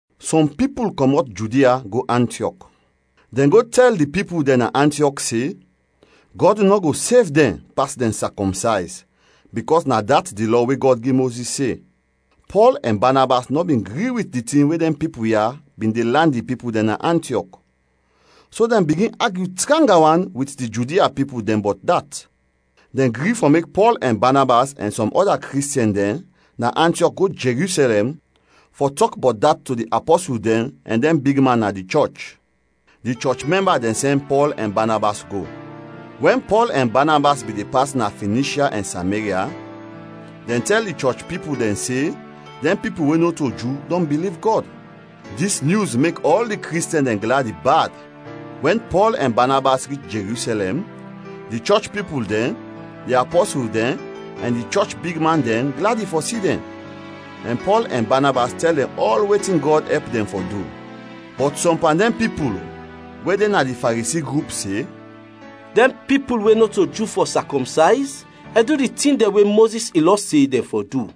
Sɔm pipul kɔmɔt Judia go Antiɔk. Dɛn go tɛl di pipul dɛn na Antiɔk se, Gɔd nɔ go sev dɛn pas dɛn sakɔmsayz bikɔs na dat di Lɔ we Gɔd gi Mozis se. Pɔl ɛn Banabas nɔ bin gri wit di tin we dɛn pipul ya bin de lan di pipul dɛn na Antiɔk, so dɛn bigin agyu tranga wan wit di Judia pipul dɛn bɔt dat. Dɛn gri fɔ mek Pɔl ɛn Banabas ɛn sɔm ɔda Kristiɛn dɛn na Antiɔk go Jerusɛlɛm fɔ tɔk bɔt dat to di apɔsul dɛn ɛn dɛn bigman na di chɔch. Di chɔch mɛmba dɛn sɛn Pɔl ɛn Banabas go. Wɛn Pɔl ɛn Banabas bin de pas na Finishya ɛn Sameria, dɛn tɛl di chɔch pipul dɛn se dɛn pipul we nɔto Ju dɔn biliv Gɔd. Dis nyus mek ɔl di Kristiɛn dɛn gladi bad. Wɛn Pɔl ɛn Banabas rich Jerusɛlɛm, di chɔch pipul dɛn, di apɔsul dɛn ɛn di chɔch bigman dɛn gladi fɔ si dɛn, ɛn Pɔl ɛn Banabas tɛl dɛn ɔl wetin Gɔd ɛp dɛn fɔ du. Bɔt sɔm pan dɛn pipul we de na di Faresi grup se, “Dɛn pipul we nɔto Ju fɔ sakɔmsayz ɛn du di tin dɛn we Mozis in Lɔ se dɛn fɔ du.”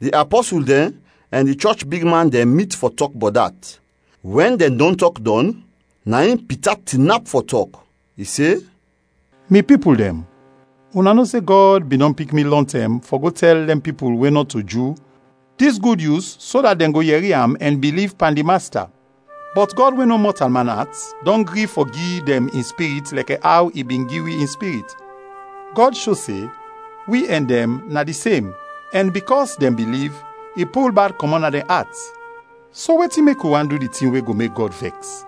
Di apɔsul dɛn ɛn di chɔch bigman dɛn mit fɔ tɔk bɔt dat. Wɛn dɛn dɔn tɔk dɔn, na in Pita tinap fɔ tɔk. I se, “Mi pipul dɛn, una no se Gɔd bin dɔn pik mi lɔntɛm fɔ go tɛl dɛn pipul we nɔto Ju dis Gud Nyus so dat dɛn go yɛri am ɛn biliv pan di Masta. Bɔt Gɔd we no mɔtalman at, dɔn gri fɔ gi dɛn in Spirit lɛkɛ aw i bin gi wi in Spirit. Gɔd sho se wi ɛn dɛn na di sem ɛn bikɔs dɛn biliv, i pul bad kɔmɔt na dɛn at. So wetin mek wi want du di tin we go mek Gɔd vɛks?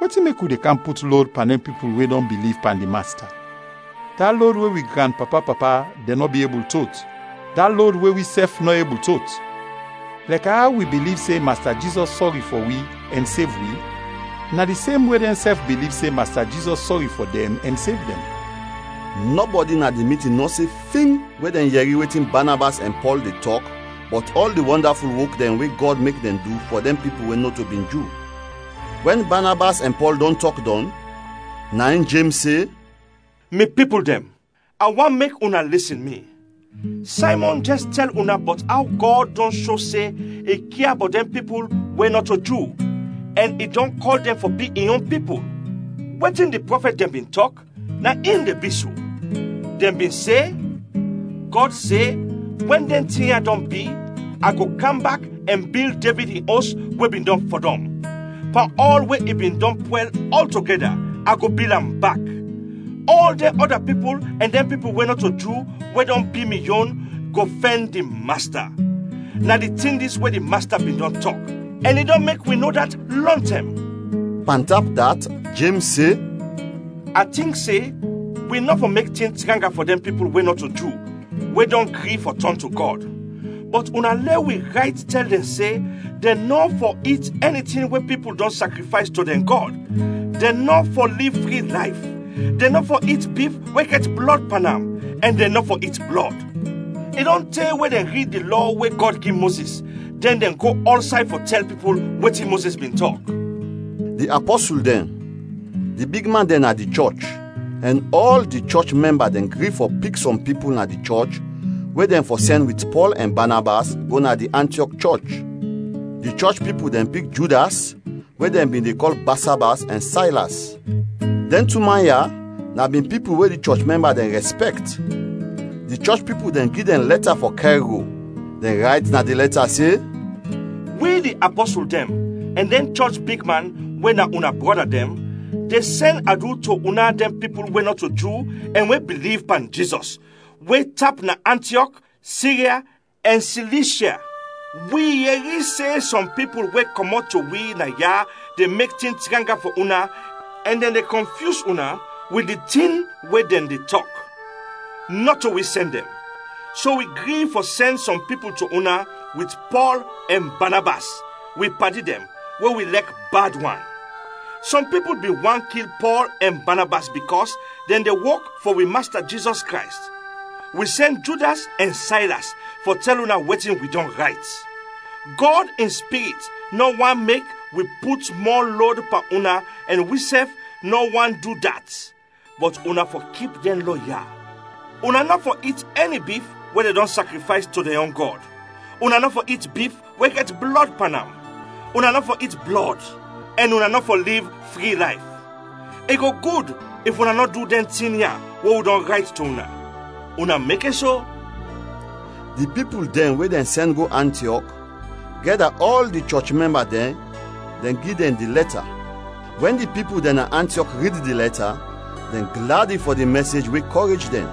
Wetin mek wi de kam put lod pan dɛn pipul we dɔn biliv pan di Masta, da lod we wi granpapa-papa dɛn nɔ bin ebul tot, da lod we wisɛf nɔ ebul tot? Lɛkɛ aw wi biliv se Masta Jizɔs sɔri fɔ wi ɛn sev wi, na di semwe dɛnsɛf biliv se Masta Jizɔs sɔri fɔ dɛn ɛn sev dɛn.” Nɔbɔdi na di mitin nɔ se fing wɛn dɛn yɛri wetin Banabas ɛn Pɔl de tɔk bɔt ɔl di wɔndaful wok dɛn we Gɔd mek dɛn du fɔ dɛn pipul we nɔto bin Ju. Wɛn Banabas ɛn Pɔl dɔn tɔk dɔn, na in Jems se, “Mi pipul dɛn, a want mek una lisin mi! Saymɔn jɛs tɛl una bɔt aw Gɔd dɔn sho se i kia bɔt dɛn pipul we nɔto Ju ɛn i dɔn kɔl dɛn fɔ bi in yon pipul. Wetin di prɔfɛt dɛn bin tɔk, na in de bi so; dɛn bin se, ‘Gɔd se, Wɛn dɛn tin ya dɔn bi, a go kam bak ɛn bil Devid in os we bin dɔn fɔdɔm. Pan ɔl we i bin dɔn pwɛl ɔltogɛda, a go bil am bak. Ɔl dɛn ɔda pipul ɛn dɛn pipul we nɔto Ju we dɔn bi mi yon, go fɛn di Masta. Na di tin dis we di Masta bin dɔn tɔk, ɛn i dɔn mek wi no dat lɔntɛm.’” Pantap dat, Jems se, “A tink se wi nɔ fɔ mek tin tranga fɔ dɛn pipul we nɔto Ju we dɔn gri fɔ tɔn to Gɔd. Bɔt una lɛ wi rayt tɛl dɛn se dɛn nɔ fɔ it ɛni tin we pipul dɔn sakrifays to dɛn gɔd, dɛn nɔ fɔ liv fri layf, dɛn nɔ fɔ it bif we gɛt blɔd pan am, ɛn dɛn nɔ fɔ it blɔd. I dɔn te we dɛn de rid di Lɔ we Gɔd gi Mozis, dɛn de go ɔlsay fɔ tɛl pipul wetin Mozis bin tɔk.” Di apɔsul dɛn, di bigman dɛn na di chɔch, ɛn ɔl di chɔch mɛmba dɛn gri fɔ pik sɔm pipul na di chɔch we dɛn fɔ sɛn wit Pɔl ɛn Banabas go na di Antiɔk chɔch. Di chɔch pipul dɛn pik Judas we dɛn bin de kɔl Basabas, ɛn Saylas. Dɛn tu man ya, na bin pipul we di chɔch mɛmba dɛn rɛspɛkt. Di chɔch pipul dɛn gi dɛn lɛta fɔ kɛr go; dɛn rayt na di lɛta se, “Wi, di apɔsul dɛn ɛn dɛn chɔch bigman, we na una brɔda dɛn, de sɛn adu to una dɛn pipul we nɔto Ju ɛn we biliv pan Jizɔs, we tap na Antiɔk, Sirya, ɛn Silishya. Wi yɛri se sɔm pipul we kɔmɔt to wi naya de mek tin tranga fɔ una ɛn dɛn de kɔnfyus una wit di tin we dɛn de tɔk. Nɔto wi sɛn dɛn. So wi gri fɔ sɛn sɔm pipul to una wit Pɔl ɛn Banabas, wi padi dɛn we wi lɛk bad wan. Sɔm pipul bin want kil Pɔl ɛn Banabas bikɔs dɛn de wok fɔ wi Masta Jizɔs Krays. Wi sɛn Judas ɛn Saylas fɔ tɛl una wetin wi dɔn rayt. Gɔd in Spirit nɔ want mek wi put mɔ lod pan una ɛn wisɛf nɔ want du dat, bɔt una fɔ kip dɛn Lɔ ya: una nɔ fɔ it ɛni bif we dɛn dɔn sakrifays to dɛn yon gɔd, una nɔ fɔ it bif we gɛt blɔd pan am, una nɔ fɔ it blɔd, ɛn una nɔ fɔ liv fri layf. I go gud if una nɔ du dɛn tin ya we wi dɔn rayt to una. Una mekes, o!” Di pipul dɛn we dɛn sɛn go Antiɔk, gɛda ɔl di chɔch mɛmba dɛn, dɛn gi dɛn di lɛta. Wɛn di pipul dɛn na Antiɔk rid di lɛta, dɛn gladi fɔ di mɛsej we kɔrej dɛn.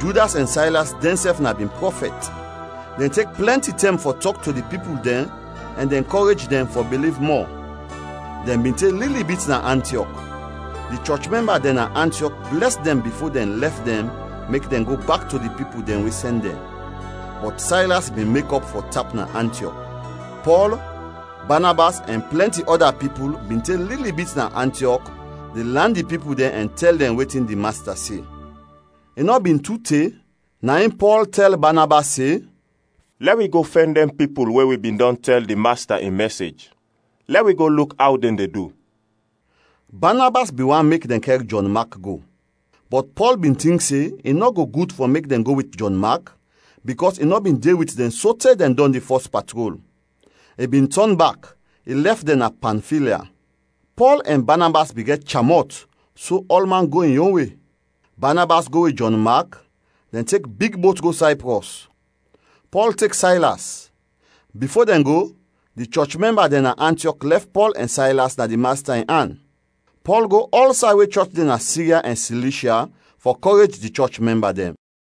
Judas ɛn Saylas dɛnsɛf na bin prɔfɛt; dɛn tek plɛnti tɛm fɔ tɔk to di pipul dɛn ɛn dɛn kɔrej dɛn fɔ biliv mɔ. Dɛn bin te lili bit na Antiɔk. Di chɔch mɛmba dɛn na Antiɔk blɛs dɛn bifo dɛn lɛf dɛn mek dɛn go bak to di pipul dɛn we sɛn dɛn. [ Bɔt Saylas bin mekɔp fɔ tap na Antiɔk.] Pɔl, Banabas, ɛn plɛnti ɔda pipul bin te lili bit na Antiɔk de lan di pipul dɛn ɛn tɛl dɛn wetin di Masta se. I nɔ bin tu te, na in Pɔl tɛl Banabas se, “Lɛ wi go fɛn dɛn pipul we wi bin dɔn tɛl di Masta in mɛsej, lɛ wi go luk aw dɛn de du.” Banabas bin want mek dɛn kɛr Jɔn Mak go, bɔt Pɔl bin tink se i nɔ go gud fɔ mek dɛn go wit Jɔn Mak bikɔs i nɔ bin de wit dɛn sote dɛn dɔn di fɔs patrol. I bin tɔn bak, i lɛf dɛn na Pamfilya. Pɔl ɛn Banabas bin gɛt cham-mɔt so ɔlman go in yon we. Banabas go wit Jɔn Mak, dɛn tek big bot go Sayprɔs. Pɔl tek Saylas. Bifo dɛn go, di chɔch mɛmba dɛn na Antiɔk lɛf Pɔl ɛn Saylas na di Masta in an. Pɔl go ɔlsay we chɔch de na Sirya ɛn Silishya fɔ kɔrej di chɔch mɛmba dɛn.